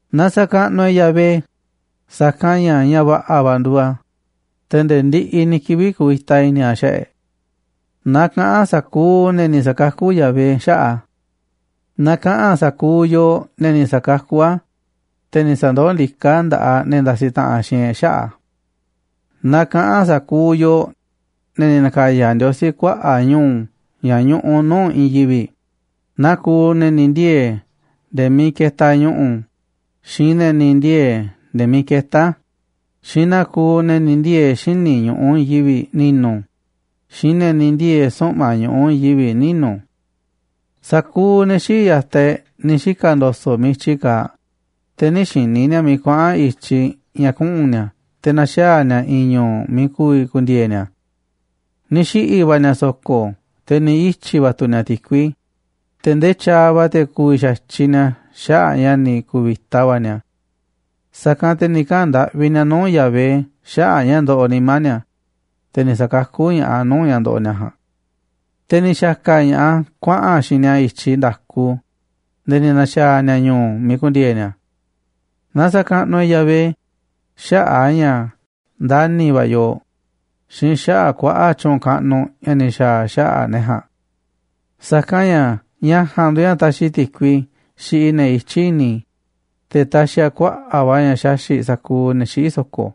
Na sa̱kaꞌnuꞌ e̱ꞌ Yahvé, sa̱kanꞌ ña̱ ña̱ va̱ꞌa̱ va̱ nduuꞌ a̱, te̱ nde̱e̱ ndiꞌiꞌ ni̱ kivi̱ꞌ kuvita i̱ni̱ a̱ xaꞌa̱ꞌ e̱ꞌ. Na kaꞌa̱n sa̱kuuꞌ ne̱ ni̱ sa̱kakú Yahvé xaꞌa̱ꞌ a̱. Na kaꞌa̱n sa̱kuuꞌ yooꞌ, ne̱ ni̱ sa̱kakú a̱, te̱ ni̱ sa̱ndoó ndiká a̱ nda̱ꞌaꞌ ne̱ ndasiꞌ taꞌanꞌ xiinꞌ e̱ꞌ xaꞌa̱ꞌ a̱. Na kaꞌa̱n sa̱kuuꞌ yooꞌ, ne̱ ni̱ na̱ka̱ya̱ Ndiosí kuaꞌa̱ꞌ ñu̱u̱ ña̱ ñuꞌuꞌ nuu̱ꞌ i̱i̱n yivi̱ꞌ, naa kuuꞌ ne̱ ni̱ ndiee̱ nde̱e̱ miiꞌ ketaꞌ ñu̱ꞌu̱, xiinꞌ ne̱ ni̱ ndiee̱ nde̱e̱ miiꞌ ketá a̱, xiinꞌ naa kuuꞌ ne̱ ni̱ ndiee̱ xíniꞌ ñu̱ꞌuꞌ i̱i̱n yivi̱ꞌ ni̱nu̱, xiinꞌ ne̱ ni̱ ndiee̱ suꞌma̱ꞌ ñu̱ꞌuꞌ i̱i̱n yivi̱ꞌ ninu̱. Sa̱kuuꞌ ne̱ xii̱ꞌ ya̱taꞌ e̱ꞌ ni̱ xika̱ ndo̱so̱ꞌ miiꞌ i̱tyi kaaꞌ, te̱ nï̱ xi̱ni̱ ni̱a̱ miiꞌ kuaꞌa̱n i̱tyiꞌ ña̱ kuꞌu̱n ni̱a̱ te̱ na̱xaa̱ ni̱a̱ i̱i̱n ñu̱u̱ miiꞌ ku̱vi̱ ku̱ndi̱e̱e̱ ni̱a̱. Ni̱ xiꞌi̱ va̱ ni̱a̱ so̱ko̱, te̱ ni̱ ityi̱ va̱ tu̱ ni̱a̱ ti̱kui, te̱ ndee tyaaꞌ va̱ te̱ ku̱vi̱ xa̱tyiꞌ ni̱a̱ xaꞌa̱ꞌ a̱ ña̱ ni̱ ku̱vi̱ta va̱ ni̱a̱. Sa̱kanꞌ te̱ ni̱ kaꞌa̱n ndaꞌvi ni̱a̱ nuu̱ꞌ Yahvé xaꞌa̱ꞌ ña̱ ndoꞌoꞌ nimá ni̱a̱, te̱ ni̱ sa̱kakú ña̱ꞌaꞌ a̱ nuu̱ꞌ ña̱ ndoꞌoꞌ ni̱a̱ ja̱a̱nꞌ. Te̱ ni̱ xa̱ka̱ ña̱ꞌaꞌ a̱ kuaꞌa̱n a̱ xiinꞌ ni̱a̱ i̱tyiꞌ nda̱ku nde̱e̱ ni̱ na̱xaa̱ ni̱a̱ ñu̱u̱ miiꞌ ku̱ndi̱e̱e̱ ni̱a̱. Na sa̱kaꞌnuꞌ e̱ꞌ Yahvé xaꞌa̱ꞌ a̱ ña̱ ndani̱ va̱ a̱ yooꞌ xiinꞌ xaꞌa̱ꞌ kuaꞌa̱ꞌ tyu̱u̱n kaꞌnuꞌ ña̱ ni̱ xa̱a̱ a̱ xaꞌa̱ꞌ ne̱ ja̱a̱nꞌ. Sa̱kanꞌ ña̱ ña̱ ja̱a̱nꞌ nduuꞌ ña̱ taxiꞌ ti̱kui xiꞌiꞌ ne̱ ityí i̱ni̱, te̱ taxiꞌ a̱ kuaꞌa̱ꞌ va̱ ña̱ xaxi̱ꞌ sa̱kuuꞌ ne̱ xiꞌí so̱ko̱.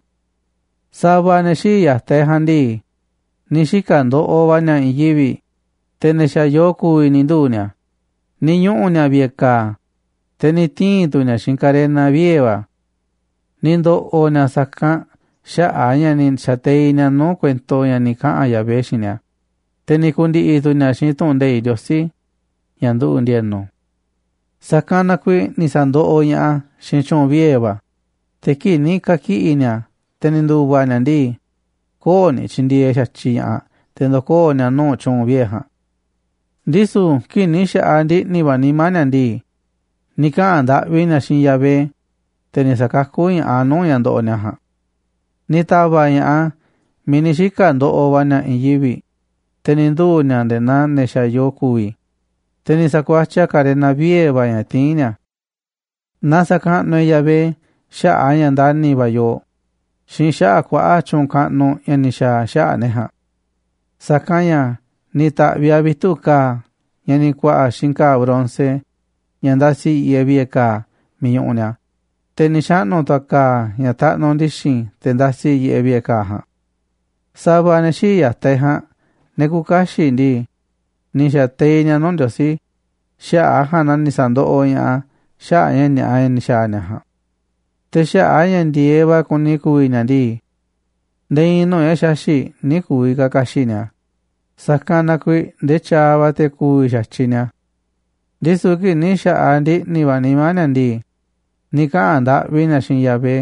Sa̱va̱ ne̱ xii̱ꞌ ya̱taꞌ e̱ꞌ ja̱a̱nꞌ ndii, ni̱ xika̱ ndoꞌoꞌ va̱ ni̱a̱ i̱i̱n yivi̱ꞌ, te̱ ne̱ xa̱ yoo ku̱vi̱ ni̱ nduu̱ ni̱a̱, ni̱ ñuꞌu̱ ni̱a̱ vi̱ꞌe̱ ka̱a̱, te̱ ni̱ tii̱n tu̱ ni̱a̱ xiinꞌ karena vie̱ va̱. Ni̱ ndo̱ꞌo̱ ni̱a̱ sa̱kanꞌ xaꞌa̱ꞌ a̱ ña̱ ni̱ xa̱teiꞌ ni̱a̱ nuu̱ꞌ kuento ña̱ ni̱ kaꞌa̱n Yahvé xiinꞌ ni̱a̱, te̱ ni̱ ku̱ndi̱ꞌi̱ tu̱ ni̱a̱ xiinꞌ tu̱ꞌu̱n nde̱iꞌ Ndiosí ña̱ nduꞌu̱ꞌ ndi̱e̱nu̱. Sa̱kanꞌ na kuiiꞌ ni̱ sa̱ndoꞌoꞌ ña̱ꞌaꞌ a̱ xiinꞌ tyu̱u̱n vie̱ va̱, te̱ kii̱ꞌ ni̱ ka̱kiꞌi̱ ni̱a̱, te̱ ni̱ ndu̱va̱ ni̱a̱ ndii, köo̱ꞌ ni̱ tyindieeꞌ xa̱tyiꞌ ña̱ꞌaꞌ te̱ ndo̱koo̱ ni̱a̱ nuu̱ꞌ tyu̱u̱n vie̱ ja̱a̱nꞌ. Ndisu̱ kii̱ꞌ ni̱ xa̱ꞌaꞌ ndiꞌni̱ va̱ nimá ni̱a̱ ndii, ni̱ kaꞌa̱n ndaꞌvi ni̱a̱ xiinꞌ Yahvé, te̱ ni̱ sa̱kakú ña̱ꞌaꞌ a̱ nuu̱ꞌ ña̱ ndoꞌoꞌ ni̱a̱ ja̱a̱nꞌ. Ni̱ ta̱va̱ꞌ ña̱ꞌaꞌ a̱ miiꞌ ni̱ xika̱ ndoꞌoꞌ va̱ ni̱a̱ i̱i̱n yivi̱ꞌ, te̱ ni̱ nduu̱ ni̱a̱ nde̱e̱ naa ne̱ xa̱ yoo ku̱vi̱, te̱ ni̱ sa̱kuatyiꞌ a̱ karena vie̱ va̱ ña̱ tiín ni̱a̱. Na sa̱kaꞌnuꞌ e̱ꞌ Yahvé xaꞌa̱ꞌ a̱ ña̱ ndani̱ va̱ a̱ yooꞌ xiinꞌ xaꞌa̱ꞌ kuaꞌa̱ꞌ tyu̱u̱n kaꞌnuꞌ ña̱ ni̱ xa̱a̱ a̱ xaꞌa̱ꞌ ne̱ ja̱a̱nꞌ. Sa̱kanꞌ ña̱ ni̱ ta̱ꞌviꞌ a̱ vitu̱ꞌ ka̱a̱ ña̱ ni̱ ku̱a̱ꞌa̱ xiinꞌ ka̱a̱ bronce ña̱ ndasiꞌ yiꞌeꞌ vi̱ꞌe̱ ka̱a̱ miiꞌ ñuꞌuꞌ ni̱a̱, te̱ ni̱ xaꞌnu̱ tu̱ a̱ ka̱a̱ ña̱ taꞌnuꞌ ndi̱xi̱n te̱ ndasi yiꞌeꞌ vi̱ꞌe̱ ka̱a̱ ja̱a̱nꞌ. Sa̱va̱ ne̱ xii̱ꞌ ya̱taꞌ e̱ꞌ ja̱a̱nꞌ, ne̱ küuꞌ kaxiꞌ ndii, ni̱ xa̱teiꞌ ni̱a̱ nuu̱ꞌ Ndiosí, xaꞌa̱ꞌ a̱ ja̱a̱nꞌ na ni̱ sa̱ndoꞌoꞌ ña̱ꞌaꞌ a̱ xaꞌa̱ꞌ ña̱ ni̱a̱ꞌa ña̱ ni̱ xa̱a̱ ni̱a̱ ja̱a̱nꞌ. Te̱ xaꞌa̱ꞌ a̱ ña̱ ndi̱e̱eꞌ va̱ kuni ku̱vi̱ ni̱a̱ ndii, nde̱e̱ i̱i̱n nuu̱ꞌ ña̱ xaxi̱ꞌ nï̱ ku̱vi̱ ka̱ ka̱xi̱ꞌ ni̱a̱, sa̱kanꞌ na kuiiꞌ ndee tyaaꞌ va̱ te̱ ku̱vi̱ xa̱tyiꞌ ni̱a̱. Ndisu̱ kii̱ꞌ ni̱ xa̱ꞌaꞌ ndiꞌni̱ va̱ nimá ni̱a̱ ndii, ni̱ kaꞌa̱n ndaꞌvi ni̱a̱ xiinꞌ Yahvé,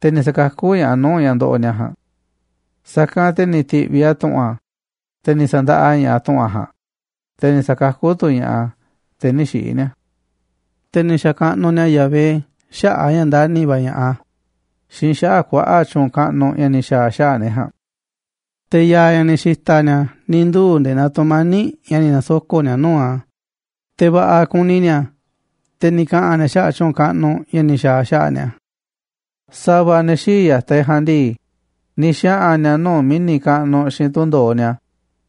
te̱ ni̱ sa̱kakú ña̱ꞌaꞌ a̱ nuu̱ꞌ ña̱ ndoꞌoꞌ ni̱a̱ ja̱a̱nꞌ. Sa̱kanꞌ te̱ ni̱ ti̱ꞌviꞌ a̱ tu̱ꞌu̱n a̱, te̱ ni̱ sa̱ndaꞌa ña̱ꞌaꞌ tu̱ꞌu̱n a̱ ja̱a̱nꞌ, te̱ ni̱ sa̱kakú tu̱ ña̱ꞌaꞌ a̱, te̱ nï̱ xiꞌi̱ ni̱a̱. Te̱ ni̱ xa̱kaꞌnuꞌ ni̱a̱ Yahvé xaꞌa̱ꞌ a̱ ña̱ ndani̱ va̱ a̱ ña̱ꞌaꞌ a̱ xiinꞌ xaꞌa̱ꞌ kuaꞌa̱ꞌ tyu̱u̱n kaꞌnuꞌ ña̱ ni̱ xa̱a̱ a̱ xaꞌa̱ꞌ ne̱ ja̱a̱nꞌ. Te̱ ya̱a̱ ña̱ ni̱ xi̱ta̱ ni̱a̱ ni̱ nduu̱ nde̱e̱ naa tu̱mani̱ꞌ ña̱ ni̱ na̱soko̱ꞌ ni̱a̱ nuu̱ꞌ a̱, te̱ va̱ꞌa̱ kuni ni̱a̱, te̱ ni̱ kaꞌa̱n ni̱a̱ xaꞌa̱ꞌ tyu̱u̱n kaꞌnuꞌ ña̱ ni̱ xa̱a̱ a̱ xaꞌa̱ꞌ ni̱a̱. Sa̱va̱ ne̱ xii̱ꞌ ya̱taꞌ e̱ꞌ ja̱a̱nꞌ ndii, ni̱ xaꞌa̱n ni̱a̱ nuu̱ꞌ mi̱ni̱ kaꞌnuꞌ xiinꞌ tundo̱oꞌ ni̱a̱,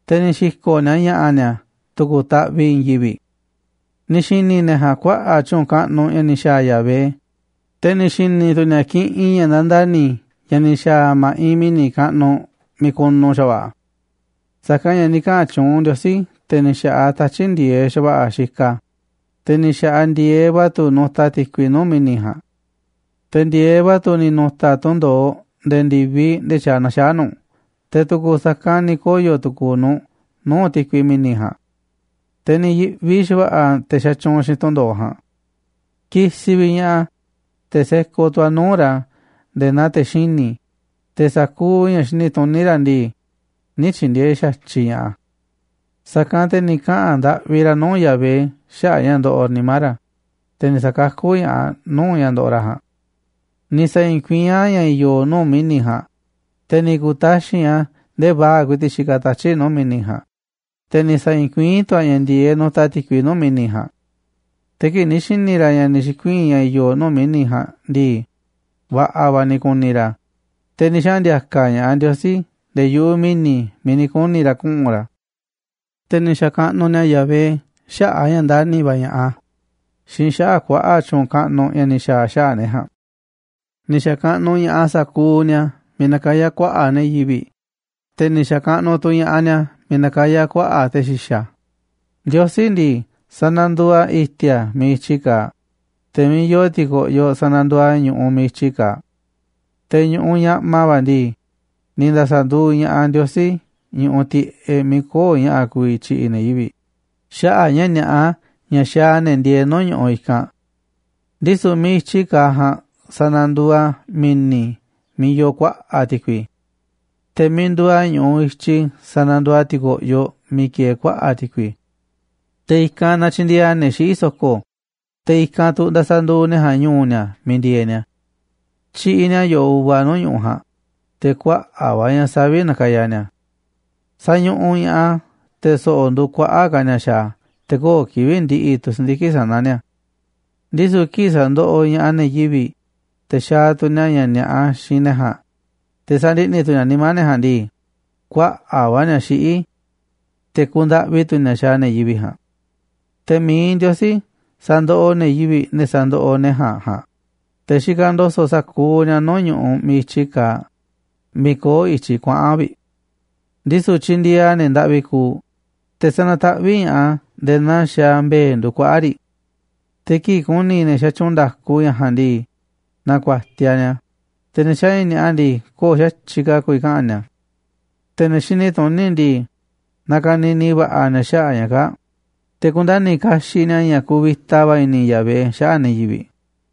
te̱ ni̱ xi̱ko̱ꞌ ni̱a̱ ña̱ꞌa̱ ni̱a̱ tu̱ku̱ taꞌviꞌ i̱i̱n yivi̱ꞌ. Ni̱ xi̱ni̱ ne̱ ja̱a̱nꞌ kuaꞌa̱ꞌ tyu̱u̱n kaꞌnuꞌ ña̱ ni̱ xa̱a̱ Yahvé, te̱ ni̱ xi̱ni̱ tu̱ ni̱a̱ kiꞌinꞌ ña̱ nandani̱ ña̱ ni̱ xa̱a̱ a̱ ma̱ꞌiꞌ mi̱ni̱ kaꞌnuꞌ miiꞌ kunu xa̱va̱ꞌa̱. Sa̱kanꞌ ña̱ ni̱ kaꞌa̱n tyuunꞌ Ndiosí, te̱ ni̱ xa̱ꞌaꞌ tatyi̱ꞌ ndi̱e̱eꞌ xa̱va̱ꞌa̱ xikaꞌ a̱, te̱ ni̱ xa̱ꞌaꞌ ndi̱e̱eꞌ va̱ tu̱ nutaꞌ ti̱kui nuu̱ꞌ mi̱ni̱ ja̱a̱nꞌ. Te̱ ndi̱e̱eꞌ va̱ tu̱ ni̱ nu̱ta̱ tundo̱oꞌ nde̱e̱ ndi̱viꞌ ndee tyaaꞌ na̱xaa̱ nu̱ꞌ, te̱ tu̱ku̱ sa̱kanꞌ ni̱ koyo̱ tu̱ku̱u̱ nu̱ꞌ nuu̱ꞌ ti̱kui mi̱ni̱ ja̱a̱nꞌ, te̱ ni̱ yi̱ꞌvi xa̱va̱ꞌa̱ te̱ xatyuunꞌ xiinꞌ tundo̱oꞌ ja̱a̱nꞌ. Kisiꞌ vi̱ꞌ ña̱ꞌaꞌ a̱, te̱ sekoꞌ tu̱ a̱ nuu̱ꞌ ra̱ nde̱e̱ naa te̱ xini̱, te̱ sa̱kuuꞌ ña̱ xini tuní ra̱ ndii, nï̱ tyi̱ndi̱e̱eꞌ xa̱tyiꞌ ña̱ꞌaꞌ a̱. Sa̱kanꞌ te̱ ni̱ kaꞌa̱n ndaꞌvi ra̱ nuu̱ꞌ Yahvé xaꞌa̱ꞌ ña̱ ndoꞌoꞌ nimá ra̱, te̱ ni̱ sa̱kakú ña̱ꞌaꞌ a̱ nuu̱ꞌ ña̱ ndoꞌoꞌ ra̱ ja̱a̱nꞌ. Ni̱ sa̱i̱i̱n kuiín a̱ ña̱ i̱yo̱ nuu̱ꞌ mi̱ni̱ ja̱a̱nꞌ, te̱ ni̱ ku̱taxi̱nꞌ a̱ ndee vaa̱ꞌ ku̱i̱ti̱ꞌ xikaꞌ tatyi̱ꞌ nuu̱ꞌ mi̱ni̱ ja̱a̱nꞌ, te̱ ni̱ sa̱i̱i̱n kuiín tu̱ a̱ ña̱ ndi̱e̱eꞌ nutaꞌ ti̱kui nuu̱ꞌ mi̱ni̱ ja̱a̱nꞌ. Te̱ kii̱ꞌ ni̱ xi̱ni̱ ra̱ ña̱ ni̱ xi̱kuii̱n ña̱ i̱yo̱ nuu̱ꞌ mi̱ni̱ ja̱a̱nꞌ ndii, va̱ꞌa̱ va̱ ni̱ ku̱ni̱ ra̱, te̱ ni̱ xaꞌa̱n ndi̱a̱ka̱ ña̱ꞌaꞌ Ndiosí nde̱e̱ yu̱ꞌuꞌ mi̱ni̱ miiꞌ ni̱ kuni̱ ra̱ kuꞌu̱n ra̱. Te̱ ni̱ xa̱kaꞌnuꞌ ni̱a̱ Yahvé xaꞌa̱ꞌ a̱ ña̱ ndani̱ va̱ a̱ ña̱ꞌaꞌ a̱ xiinꞌ xaꞌa̱ꞌ kuaꞌa̱ꞌ tyu̱u̱n kaꞌnuꞌ ña̱ ni̱ xa̱a̱ a̱ xaꞌa̱ꞌ ne̱ ja̱a̱nꞌ. Ni̱ xa̱kaꞌnuꞌ ña̱ꞌaꞌ sa̱kuuꞌ ni̱a̱ miiꞌ nakayá kuaꞌa̱ꞌ ne̱ yivi̱ꞌ, te̱ ni̱ xa̱kaꞌnuꞌ tu̱ ña̱ꞌaꞌ ni̱a̱ miiꞌ nakayá kuaꞌa̱ꞌ te̱ xi̱xa̱. Ndiosí ndii, sananduuꞌ a̱ i̱ti̱a̱ miiꞌ i̱tyi kaaꞌ, te̱ miiꞌ yoo ti̱ko̱ꞌyoꞌ sananduuꞌ a̱ ñu̱ꞌuꞌ miiꞌ i̱tyi kaaꞌ. Te̱ ñu̱ꞌuꞌ ñaꞌma va̱ ndii, ni̱ nda̱sa̱ nduuꞌ ña̱ꞌaꞌ Ndiosí ñu̱ꞌuꞌ tiꞌeꞌ miiꞌ köo̱ꞌ ña̱ꞌa̱ ku̱vi̱ tyi̱ꞌi̱ ne̱ yivi̱ꞌ xaꞌa̱ꞌ ña̱ ni̱a̱ꞌa ña̱ xaaꞌ ne̱ ndieeꞌ nuu̱ꞌ ñu̱ꞌuꞌ i̱kanꞌ. Ndisu̱ miiꞌ i̱tyi kaaꞌ ja̱a̱nꞌ sananduuꞌ a̱ mi̱ni̱ miiꞌ yoo kuaꞌa̱ꞌ ti̱kui, te̱ miiꞌ nduuꞌ a̱ ñu̱ꞌuꞌ i̱tyi sananduuꞌ a̱ ti̱ko̱ꞌyoꞌ miiꞌ kieeꞌ kuaꞌa̱ꞌ ti̱kui. Te̱ i̱kanꞌ natyindieeꞌ a̱ ne̱ xiꞌí so̱ko̱, te̱ i̱kanꞌ tu̱ ndasa nduuꞌ ne̱ ja̱a̱nꞌ ñu̱u̱ ni̱a̱ miiꞌ ndieeꞌ ni̱a̱. Tyiꞌiꞌ ni̱a̱ yo̱ꞌoꞌ uva nuu̱ꞌ ñu̱ꞌuꞌ ja̱a̱nꞌ, te̱ kuaꞌa̱ꞌ va̱ ña̱ savi̱ꞌ nakaya ni̱a̱. Sañuꞌuꞌ ña̱ꞌaꞌ a̱ te̱ so̱ꞌo̱ nduuꞌ kuaꞌa̱ꞌ ka̱ ni̱a̱ xaaꞌ a̱, te̱ köo̱ꞌ kivi̱ꞌ ndiꞌiꞌ tu̱ si̱ndiki̱ꞌ sana̱ ni̱a̱. Ndisu̱ kii̱ꞌ sandoꞌoꞌ ña̱ꞌaꞌ ne̱ yivi̱ꞌ, te̱ xaaꞌ tu̱ ni̱a̱ ña̱ ni̱a̱ꞌa xiinꞌ ne̱ ja̱a̱nꞌ, te̱ sandiꞌni̱ tu̱ ni̱a̱ nimá ne̱ ja̱a̱nꞌ ndii, kuaꞌa̱ꞌ va̱ ni̱a̱ xiꞌí, te̱ kundaꞌvi tu̱ ni̱a̱ xaaꞌ ne̱ yivi̱ꞌ ja̱a̱nꞌ. Te̱ mi̱iꞌ Ndiosí sandoꞌoꞌ ne̱ yivi̱ꞌ, ne̱ sa̱ndoꞌoꞌ ne̱ ja̱a̱nꞌ ja̱a̱nꞌ, te̱ xikaꞌ ndo̱so̱ꞌ sa̱kuuꞌ ni̱a̱ nuu̱ꞌ ñu̱ꞌuꞌ miiꞌ i̱tyi kaaꞌ miiꞌ köo̱ꞌ i̱tyiꞌ kuaꞌa̱n vi̱ꞌ. Ndisu̱ tyindieeꞌ a̱ ne̱ ndaꞌvi kuuꞌ, te̱ sanataꞌvíꞌ ña̱ꞌaꞌ a̱ nde̱e̱ naa xaaꞌ mbe̱e̱ nduuꞌ kuaꞌa̱ꞌ riꞌ. Te̱ kii̱ꞌ ku̱ni̱ ne̱ xatyuunꞌ nda̱ku ña̱ ja̱a̱nꞌ ndii, na̱ku̱a̱tiaꞌ ni̱a̱, te̱ ne̱ xaaꞌ ña̱ ni̱a̱ꞌa ndii, köo̱ꞌ xa̱tyiꞌ ka̱ a̱ ku̱vi̱ kaꞌa̱n ni̱a̱. Te̱ ne̱ xini tuní ndii, na ka̱ni̱ni̱ va̱ꞌa̱ ni̱a̱ xaꞌa̱ꞌ ña̱ kaa̱ꞌ, te̱ ku̱nda̱ni̱ kaxiꞌ ni̱a̱ ña̱ kuvita va̱ i̱ni̱ Yahvé xaꞌa̱ꞌ ne̱ yivi̱ꞌ.